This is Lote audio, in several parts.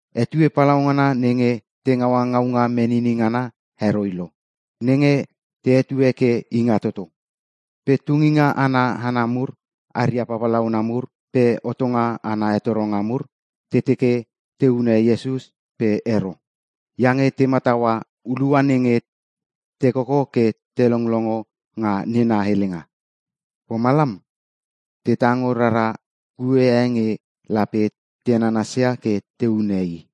Etue palaungana nenge te ngaua ngaunga menini ngana heroi lo nenge te hetue ke Ingatoto. Pe tunginga ana hana mur aria papalauna mur pe hotonga ana hetoronga mur te teke te hune Iesus pe ero. Iange te mataua hulua nenge te koko ke te longlongo nga nena helenga. Pomalam te tango rara kue e nge lape te nanasia ke te hune i.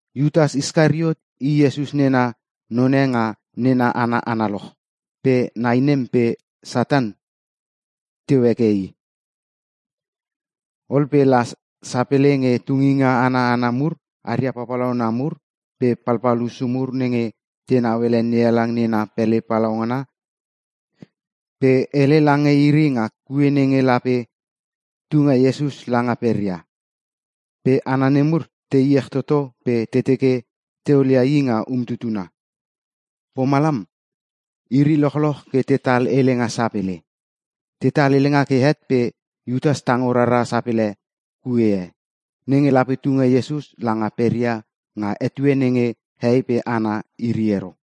Iutas Iskariot i Iesus nena none nga nena hana analoch pe nai nem pe Satan teu heke i. Ol pe la sapele nge tunginga ana hana mur aria papalauna mur pe palpal hussu mur nenge tenau ele NeHalang nena pele palaungana pe hele lange iri nga kue nenge lape tunge Iesus langa peria. Pe hana nemur te iech toto pe te teke te olia i nga umtutuna. Pomalam iri lochloch ke tetal helenga sapele. Tetal helenga ke het pe Iutas tango rara sapele kue e, nenge lape tunge Iesus langa peria nga etue nenge hehei pe hana iri ero.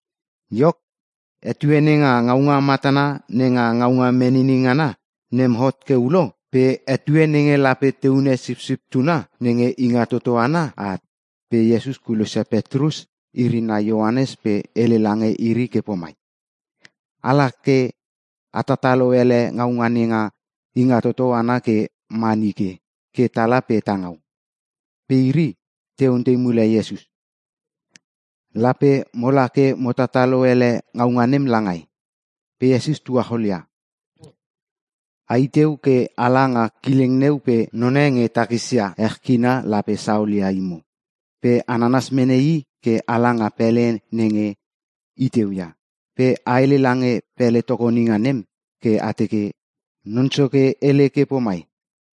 Iok, etue nenga ngaunga matana nenga ngaunga menini ngana nem hot ke ulo pe etue nenge lape te hune Sipsip Tuna nenge Ingatoto ana at. Pe Iesus kulosia Petrus iri nai Ioanes pe hele lange iri ke pomai, “Ala ke a tatalo ele ngaunga nenga Ingatoto ana ke ma nike ke tala pe tangau.” Pe iri te ontei mule Iesus, “Lape mola ke mo tatalo ele ngaunga nem langai?” Pe Iesus tuacholia, “Ai teu ke ala nga kileng neu pe none nge takisia ech kina lape saolia imo. Pe a nanas mene i ke a langa pele nenge i teu ia. Pe a hele lange pele tokoninga nem ke a teke, ‘Non Soke hele ke pomai: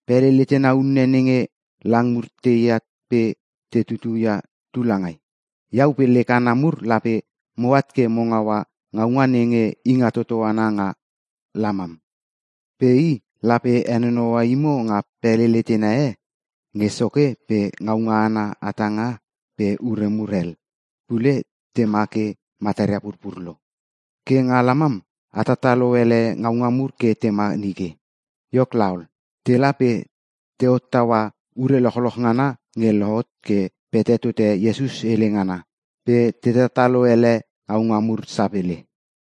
Pele letena unne nenge lang mur teat pe te tutu ia tu langai? Iau pe lek hana mur lape moat ke mo ngaua ngaunga nenge Ingatoto ana nga lamam.’ Pe i lape henonoua imo nga pele letena e nge soke pe ngaunga ana hatanga pe ure mur hel pule tema ke mataria purpur lo. Ke nga lamam a tatalo ele ngaunga mur ke tema nike.” Iok laol, tela pe te hottaua ure lochloch ngana nge lohot ke pete tote Iesus hele ngana pe te tatalo ele ngaunga mur sapele.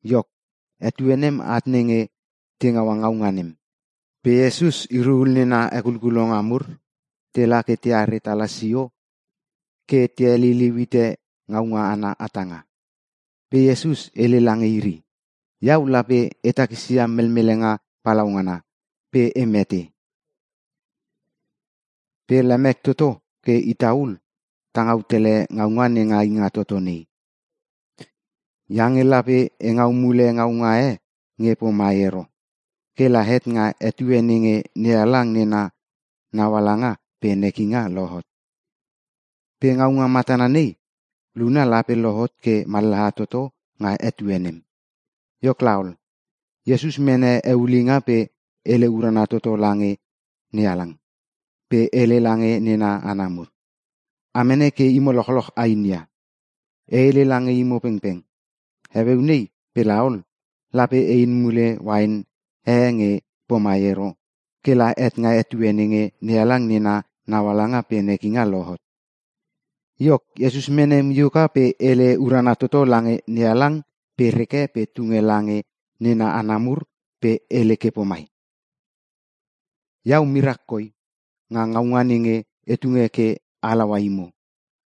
Iok, etue nem at nenge te ngaua ngaunga nem. Pe Iesus iri ul nena hekulkulonga mur tela ke teare tala sio ke te heliliu hite ngaunga ana hatanga. Pe Iesus hele lange iri, “Iau lape e takisia melmelenga palaungana pe e mete. Pe lemek toto ke ita ul ta ngau tele ngaunga nenga Ingatoto nei. Iange lape e ngau mule ngaunga e nge pomai ero, kela het nga etue nenge NeHalang nena naualanga pe nekinga lohot. Pe ngaunga matana nei, luna lape lohot ke mallaha toto nga etue nem.” Iok laol, Iesus mene eulinga pe hele urana toto lange NeHalang pe hele lange nena hana mur, “A mene ke imo lochloch ainia. E hele lange imo pengpeng, heueu nei pe laol, lape e in mule uain e nge pomai ero kela het nga etue nenge NeHalang nena naualanga pe nekinga lohot.” Iok Iesus mene mioka pe hele urana toto lange NeHalang pe reke pe tunge lange nena hana mur pe hele ke pomai, “Iau mirak koi nga ngaunga nenge e tunge ke halaua imo.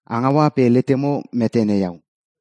A ngaua pe letemo metene iau.”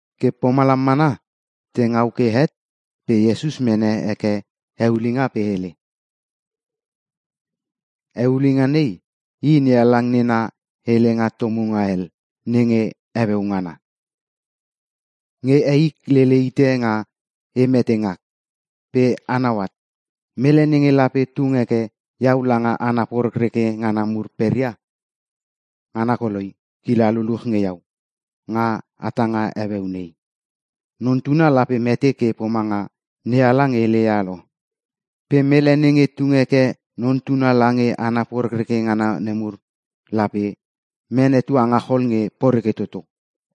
Ke pomalam mana, te ngau ke het pe Iesus mene heke eulinga pe hele, “Eulinga nei, i NeHalang nena helenga tomunga hel nenge heueu ngana, nge eik lele ite nga e mete ngak. Pe anau at, mele nenge lape tung heke iau langa hana porekreke ngana mur peria, ngana koloi kila luluch nge iau nga hatanga heueu nei. Non Tuna lape mete ke pomanga NeHalang heleia lo, pe mele nenge tung heke Non Tuna lange hana porekreke ngana nemur, lape mene tuangachol nge poreke toto.”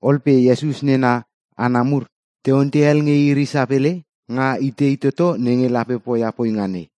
Ol pe Iesus nena hana mur te ontei hel nge iri sapele, nga itei toto nenge lape poia poinga nei.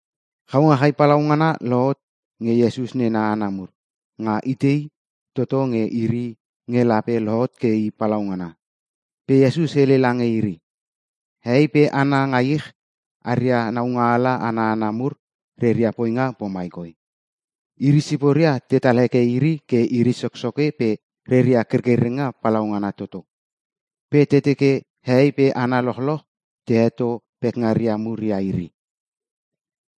Chaungachai palaungana lohot nge Iesus nena hana mur nga itei toto nge iri nge lape lohot ke i palaungana. Pe Iesus hele lange iri, “Hehei pe hana nga ich aria naungaala ana hana mur reria poinga pomai koi; iri siporia tetal heke iri ke iri soksoke pe reria kerkerenga palaungana toto. Pe te teke hehei pe hana lochloch te heto pekngaria mur ia iri.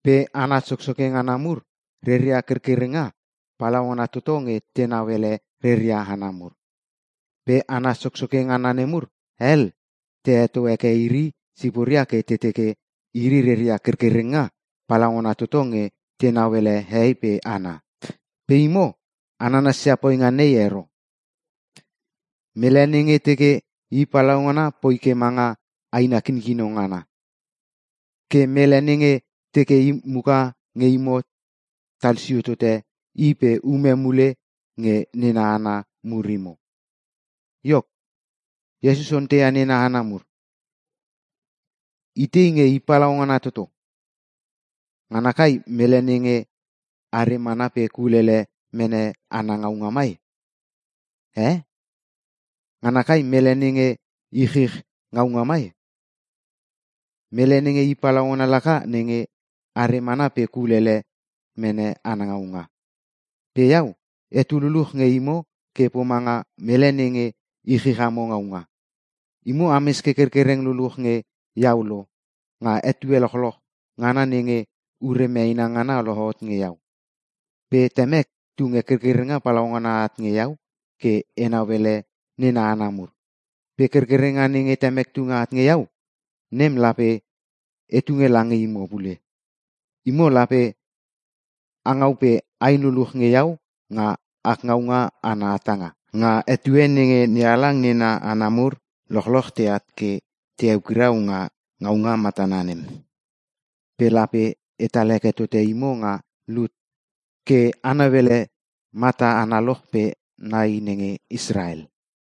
“Pe hana soksoke ngana mur, reria kerkerenga palaungana toto nge tenau ele reria hana mur. Pe hana soksoke ngana nemur hel, te heto heke iri siporia ke te teke iri reria kerkerenga palaungana toto nge tenau ele hehei pe hana! Pe imo, a nanasia poinga nei ero. Mele nenge teke i palaungana poi ke manga aina kinkino ngana. Ke mele nenge teke i muka nge imo talsio tote i pe ume mule nge nena hana mur imo.” Iok, Iesus onteia nena hana mur, “Itei nge i palaungana toto? Ngana kai mele nenge are mana pe kulele mene ana ngaunga mai? Eh! ngana kai mele nenge ichich ngaunga mai? Mele nenge i palaungana laka nenge are mana pe kulele mene ana ngaunga. Pe iau etu luluch nge imo ke pomanga mele nenge ichich amo ngaunga. Imo ames ke kerkereng luluch nge iau lo nga etue lochloch ngana nenge ure meena ngana lohot nge iau. Pe temek tunge kerkerenga palaungana at nge iau ke enau ele nena hana mur. Pe kerkerenga nenge temek tunge at nge iau nem lape e tunge lange imo pule. Imo lape a ngau pe ain luluch nge iau nga ak ngaunga ana hatanga, nga etue nenge NeHalang nena hana mur lochloch teat ke te eukirau nga ngaunga matana nem. Pe lape etal heke tote imo nga lut ke a nauele mata analoch pe nai nenge Israel.”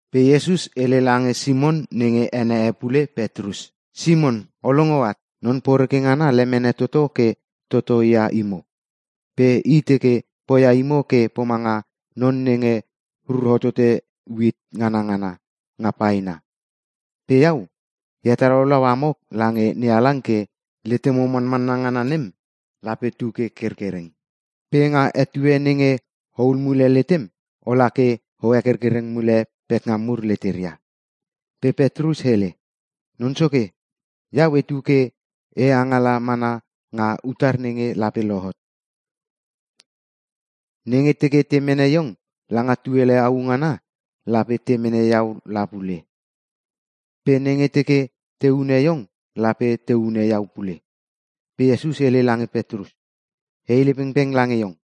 Pe Iesus hele lange Simon nenge ene e pule Petrus, “Simon o longo at, Non Poreke ngana lemene toto ke totoi ia imo. Pe i teke poia imo ke pomanga non nenge rur hotote uit nganangana nga paena. Pe iau e hetalaulau amo lange NeHalang ke letemo manmanna ngana nem lape tu ke kerkereng. Pe nga etue nenge ohul mule letem, ola ke o hekerkereng mule pekngam mur leteria.” Pe Petrus hele, “Non Soke, iau etu ke e angala mana nga utar nenge lape lohot. Nenge teke te mene iong langa tuele au ngana lape te mene iau la pule. Pe nenge teke te hune iong lape te hune iau pule.” Pe Iesus hele lange Petrus, “E hele pengpeng lange iong,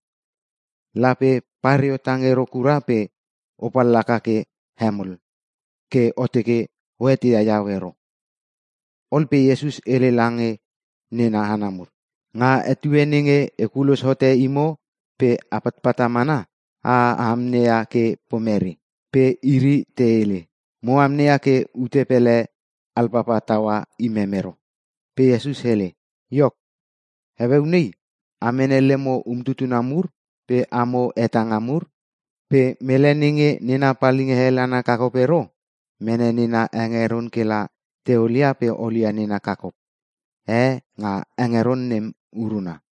lape pareo tang ero kura pe o pallaka ke hemol ke o teke o eteia iau ero.” Ol pe Iesus hele lange nena hana mur, “Nga etue nenge e kulos hote imo pe a patpata mana, a amneia ke pomere?” Pe iri te hele, “Mo amneia ke ute pele alpapa taua imem ero.” Pe Iesus hele, “Iok heueu nei a mene lemo umtutuna mur pe amo hetanga mur. Pe mele nenge nena palinga hel ana kakop ero, mene nena hengeron kela teolia pe olia nena kakop e nga hengeron nem uruna.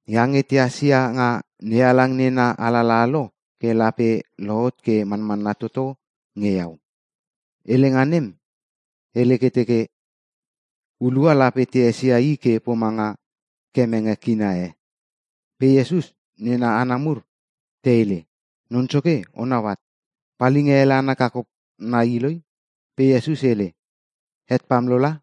Iange tehas ia nga NeHalang nena alalaha lo ke lape lohot ke manmanna toto nge iau. Helenga nem hele ke teke, ‘Hulua lape te esia i ke pomanga kemenge kina e.’” Pe Iesus nena hana mur te hele, “Non Soke onau at, palinga hel ana kakop nai iloi.” Pe Iesus hele, “Het pam lo la!”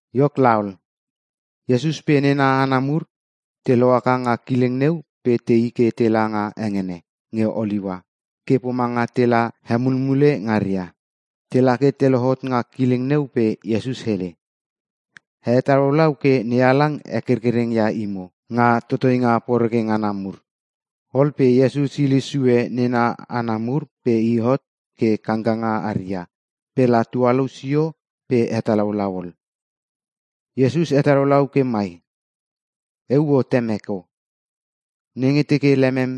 Iok laol, Iesus pe nena hana mur te lohaka nga kileng neu pe tei ke tela nga hengene nge Oliua ke pomanga tela hemulmule ngaria. Tela ke te lohot nga kileng neu pe Iesus hele, “A hetalaulau ke NeHalang hekerkereng ia imo nga totoinga poreke ngana mur.” Ol pe Iesus hile sue nena hana mur pe i hot ke kangkanga aria pela tualou sio pe hetalaulau ol. Iesus hetalaulau ke mai, “Euo Temek O! Nenge teke lemem,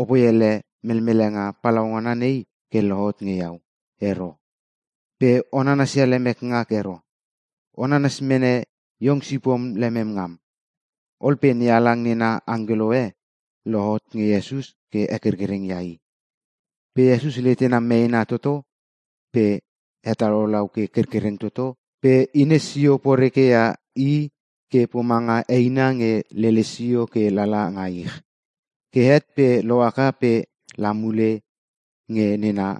opoi ele melmelenga palaungana nei ke lohot nge iau ero! Pe o nanasia lemek ngak ero, o nanas mene iong sipom lemem ngam.” Ol pe NeHalang nena angkelo e lohot nge Iesus ke hekerkereng ia i. Pe Iesus letena meena toto pe hetalaulau ke kerkereng toto pe hines sio porekeia i ke pomanga eina nge lele sio ke lala nga ich. Ke het pe lohaka pe i la mule nge nena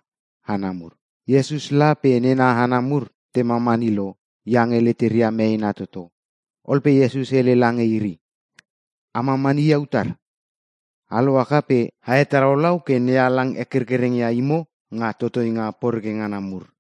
hana mur. Iesus la pe nena hana mur te mamani lo iange leteria meena toto. Ol pe Iesus hele lange iri, “A mamani ia utar? A lohaka pe a hetalaulau ke NeHalang hekerkereng ia imo nga totoinga poreke ngana mur.”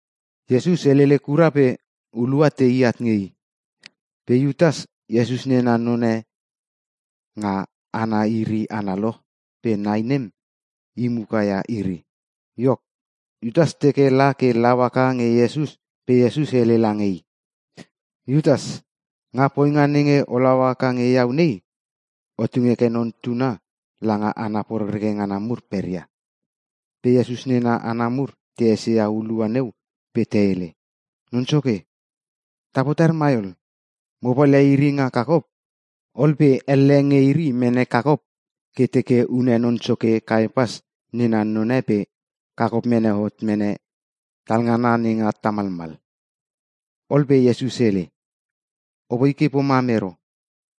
Iesus helele kura pe hulua tei at nge i. Pe Iutas, Iesus nena none nga hana iri analoch pe nai nem, i mukaia iri. Iok, Iutas teke la ke lau haka nge Iesus pe Iesus hele lange i, “Iutas, nga poinga nenge olau haka nge iau nei, o tung heke Non Tuna langa hana porekreke ngana mur peria.” Pe Iesus nena hana mur te esia hulua neu pe te hele, “Non soke! Ta potar mai ol! Mo palia iri nga kakop?” Ol pe elle nge iri mene kakop ke teke hune non soke Kaepas nena none pe kakop mene hot mene talngana nenga tamalmal. Ol pe Iesus hele, “Apoi ke pomam ero!”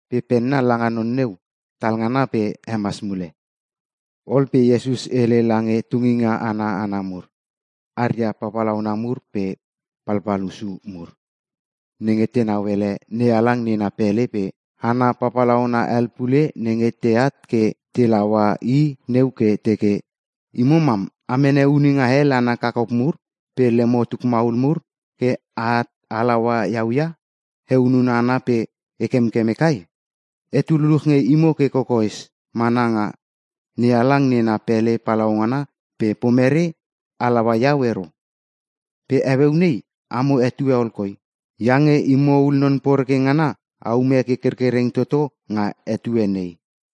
Pe penna langa non neu talngana pe hemas mule. Ol pe Iesus hele lange tunginga ana hana mur aria papalauna mur pe palpal hussu mur nenge tenau ele NeHalang nena pele pe hana papalauna hel pule nenge teat ke te laua i neu ke teke, “Imo mam a mene huninga hel ana kakop mur pe lemo tukmaul mur ke at a laua iau ia? E hunun hana pe e kemkeme kai? Etu luluch nge imo ke kokoes mana nga NeHalang nena pele palaungana pe pomere a laua iau ero? Pe heueu nei, amo etue ol koi. Iange imo ul non poreke ngana a ume ke kerkereng toto nga etue nei.”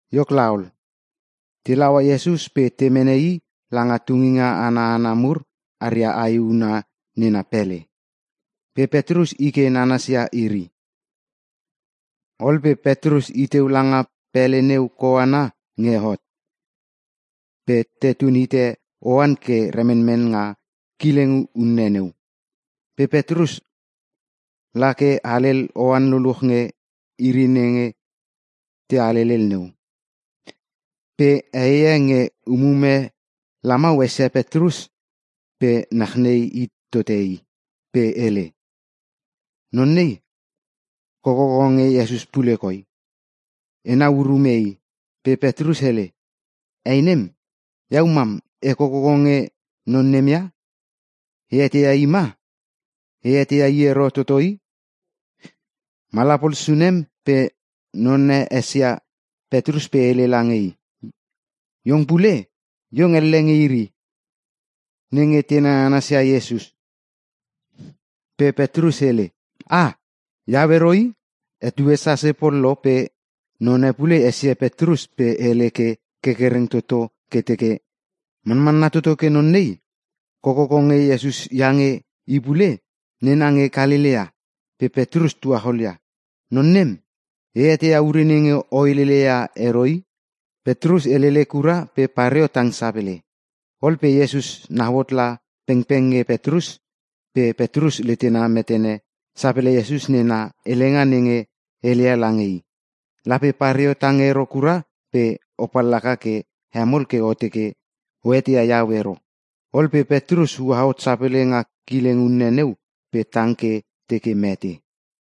Iok laol, te laua Iesus pe te mene i langa tunginga ana hana mur aria ae huna nena pele. Pe Petrus i ke nanas ia iri. Ol pe Petrus iteu langa pele neu koana nge hot. Pe tetun hite oan ke remenmen nga kileng unne neu. Pe Petrus lake halel oan luluch nge iri nenge te halelel neu. Pe heie nge umume lamau esia Petrus pe nachnei hit tote i pe hele, “Non nei, kokoko nge Iesus pule koi, enau urume i!” Pe Petrus hele, “Hei nem, iau mam e kokoko nge non nem ia? E eteia i ma? E eteia i ero toto i!” Mala pol sunem pe none esia Petrus pe hele lange i, “Iong pule, iong elle nge iri nenge te nananas ia Iesus!” Pe Petrus hele, “Ah! Iau ero i!” Etue sase pol lo pe none pule esia Petrus pe hele ke kerkereng toto ke teke, “Manmanna toto ke non nei kokoko nge Iesus iange i pule nena nge Kalelea!” Pe Petrus tuacholia, “Non nem, e eteia ure nenge o helele ia ero i!” Petrus helele kura pe pareo tang sapele. Ol pe Iesus nau hot la pengpeng nge Petrus pe Petrus letena metene sapele Iesus nena helenga nenge heleia lange i, “Lape pareo tang ero kura pe o pallaka ke hemol ke o teke o eteia iau ero.” Ol pe Petrus ua hot sapele nga kileng unne neu pe tang ke teke mete.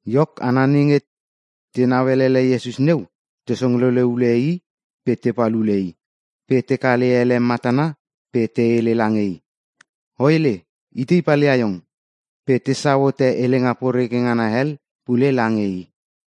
Iok, hana nenge tenau elele Iesus neu, te songlele ule i pe tepal ule i. Pe te kale ele matana pe te hele lange i, “O hele, itei palia iong!” Pe tesau hote helenga poreke ngana hel pule lange i.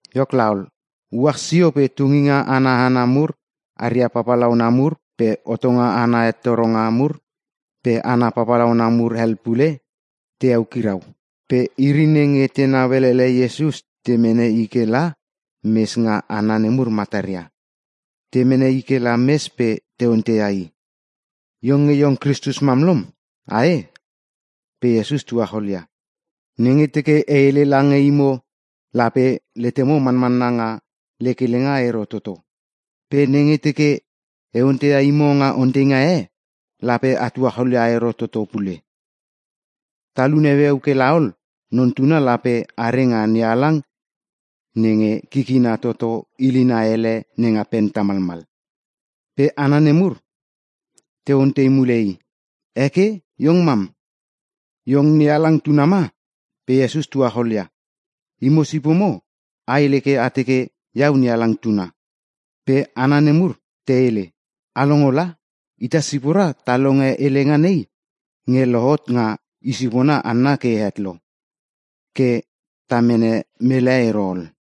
Iok laol, uach sio pe tunginga ana hana mur aria papalauna mur pe hotonga ana hetoronga mur pe hana papalauna mur hel pule te eukirau. Pe iri nenge tenau elele Iesus te mene i kela mes nga hana nemur mataria. Te mene i kela mes pe te onteia i, “Iong nge iong Kristus mam lom? Ae!?” Pe Iesus tuacholia, “Nenge teke e hele lange imo lape letemo manmanna nga lek helenga ero toto. Pe nenge teke e onteia imo nga onteinga e lape a tuacholia ero toto pule. Talun heueu ke laol, Non Tuna lape are nga NeHalang nenge kikina toto hilina ele nenga pen tamalmal.” Pe hana nemur te ontei mule i, “Eke iong mam, iong NeHalang Tuna ma?” Pe Iesus tuacholia, “Imo sipomo a hele ke a teke iau NeHalang Tuna.” Pe hana nemur te hele, “A longo la! Ita sipora ta longe helenga nei nge lohot nga i sipona hanna ke het lo. Ke ta mene mele ero ol.”